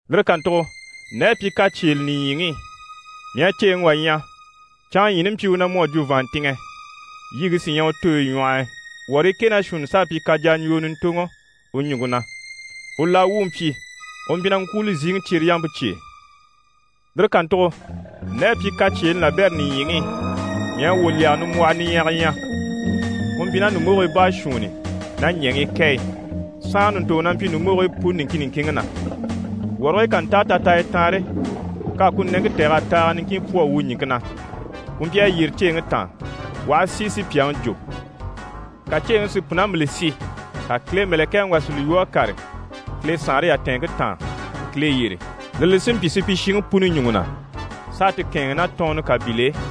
Lire kàntugo nde à pyi kacyeele nìɲyiŋi i, mii à ceeŋi wà ɲya, canŋaɲyiini mpyi u na mu à jwo vàanntinŋɛ, yiŋke sí ɲyɛ u tooyi ɲwɔh'i, wɔrii kɛ ná shuunni s'à pyi kajaɲjwoo ɲùntoŋɔ u ɲùŋke na. U laa wu u mpyi, u mpyi na ŋkwúuli ziŋi cyereyampe cye e. Lire kàntugo nde à pyi kacyeeni labɛrɛ nìɲyiŋi i, mii à wwòlyɛgɛ nimbwɔhɔ niɲyɛga ɲya. Ku mpyi ná ɲùmbogii baashuunni ná ɲɛŋii kɛ e, saanra ɲùntoŋɔ na mpyi ɲùmbogigii puni niŋkin niŋkinŋi na. Wɔrigii ká ntáa tataaya taanre, k'à ku nɛŋke tɛ̀g'a taaga niŋkin pwɔ́ a wu ɲìŋke na. Ku mpyi a yyére ceeŋi taan, u aha si si pyàŋi jò. Ka ceeŋi si pùnambile si, ka Kile mɛ̀lɛkɛŋi wà si li lwɔ́ a kàre Kile saanre yatɛɛnŋke taan, Kile yyére. Lire li sí n‑pyi supyishiŋi puni ɲùŋɔ na, s'a ti kɛ̂ɛnŋi ná tɔɔnnɔ kabil'e.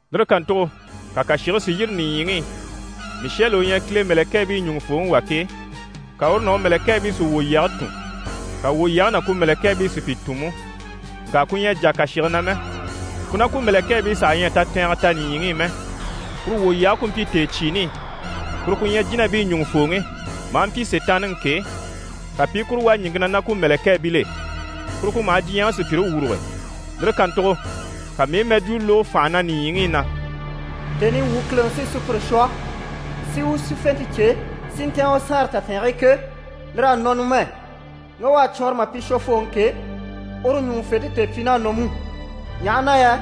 Lire kàntugo ka kàshige si yîri nìɲyiŋi i. Mishɛli u ɲyɛ Kile mɛ̀lɛkɛɛbii ɲùŋufooŋi wà ke, ka uru ná u mɛ̀lɛkɛɛbii sí wwòlyɛge tùn, ka wwòlyɛge ná ku mɛ̀lɛkɛɛbii si pi tùn mú. Ŋka ku ɲyɛ a jà kàshige na mɛ, ku ná ku mɛ̀lɛkɛɛbii saha ɲyɛ a tatɛɛngɛ ta nìɲyiŋi i mɛ. Kuru wwòlyɛge ku mpyi tèecyiini i. Kuru ku ɲyɛ jínabii ɲùŋufooŋi, maa mpyi Sitaanniŋi ke, ka pi i kuru wà ɲìŋke na ná ku mɛ̀lɛkɛɛbil'e. Kuru ku maha diɲyɛŋi sùpyire wuruge. Lire kàntugo ka mii i mɛjwuu lógo fànha na nìɲyiŋi i na: «Tèni i wuu Kileŋi sí sùpyire shwɔ, si u sífente cyêe, si ntɛ̀ɛn u saanre tatɛɛnge e ke, lir'à nɔ numɛ, ŋge u à cwɔɔnrɔ mà pyi Shwofooŋi ke, uru ɲùŋufente tèepyiin'à nɔ mú. Ɲaha na yɛ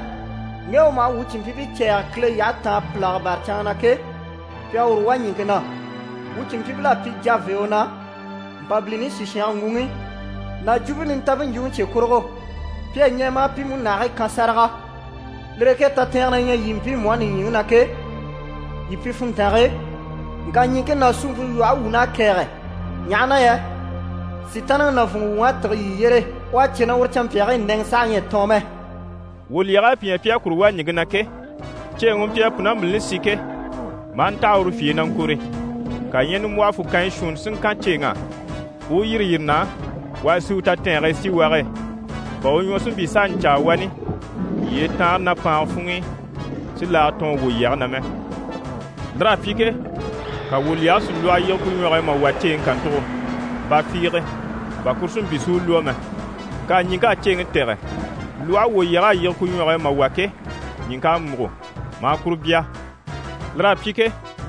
ŋge u maha wuu cìnmpyiibii cɛ̂ɛge Kile yyahe taan pìlaga bâra canŋa na ke, pi à uru wà ɲìŋke na. Wuu cìnmpyiibil'à pyi javee u na, Mpabilini sìshange ŋguŋi ná Jwumpe Nintanmpe ɲjwuŋi cye kurugo. Pi à ɲɛɛ mà pi múnahigii kan sáraga. Lire e ke tatɛɛngɛ na ɲyɛ yii mpiimu á nìɲyiŋi i ke, yii pyi funntange e, ŋka ɲìŋke ná suumpe lwɔhe wuun'à kɛ̀ɛge, ɲaha na yɛ Sitaanniŋi nàvunŋɔ wuŋ'à tîge yii yyére. U à cè na uru canmpyaagii nɛŋɛ saha ɲyɛ a tɔɔn mɛ.» Wwòlyɛg'à pi ɲya pi à kuru wà ɲìŋke na ke, ceeŋi u mpyi a pùnambilini si ke, maa ntaha uru fye e na ŋkɔ̀re. Ka ɲyɛ nimbwɔhɔ fukanya shuunni si ŋkan ceeŋ'á, u yîri yire na u a sì u tatɛɛnge e síwage e, bà u ɲwɔ si mpyi s'a ɲcaa wani yyee taanre ná paanga funŋ'i, si laaga tɔɔn wwòlyɛge na mɛ. Lir'à pyi ke, ka wwòlyɛge si lwɔhɔ yige ku ɲwɔge e mà wà ceeŋi kàntugo ba fiige, bà kuru si mpyi si u lwɔ́ mɛ. Ŋka ɲìŋk'à ceeŋi tɛ̀gɛ. Lwɔhe wwòlyɛg'à yige ku ɲwɔge e mà wà ke, ɲìŋk'à múgo, maa kuru bya. Lir'à pyi ke,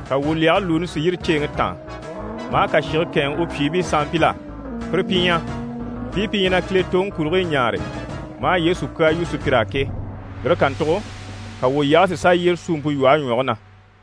ka wwòlyɛge lùuni si yîri ceeŋi taan, maa kàshige kɛ̂ɛnŋɛ u pyìibii sanmpil'á. Pire pi ɲyɛ, mpii pi ɲyɛ na Kile toŋi kurigii ɲáare, maa Yesu kyaa yu sùpyir'á ke. Lire kàntugo ka wwòlyɛge si sà yyére suumpe lwɔhe ɲwɔge na.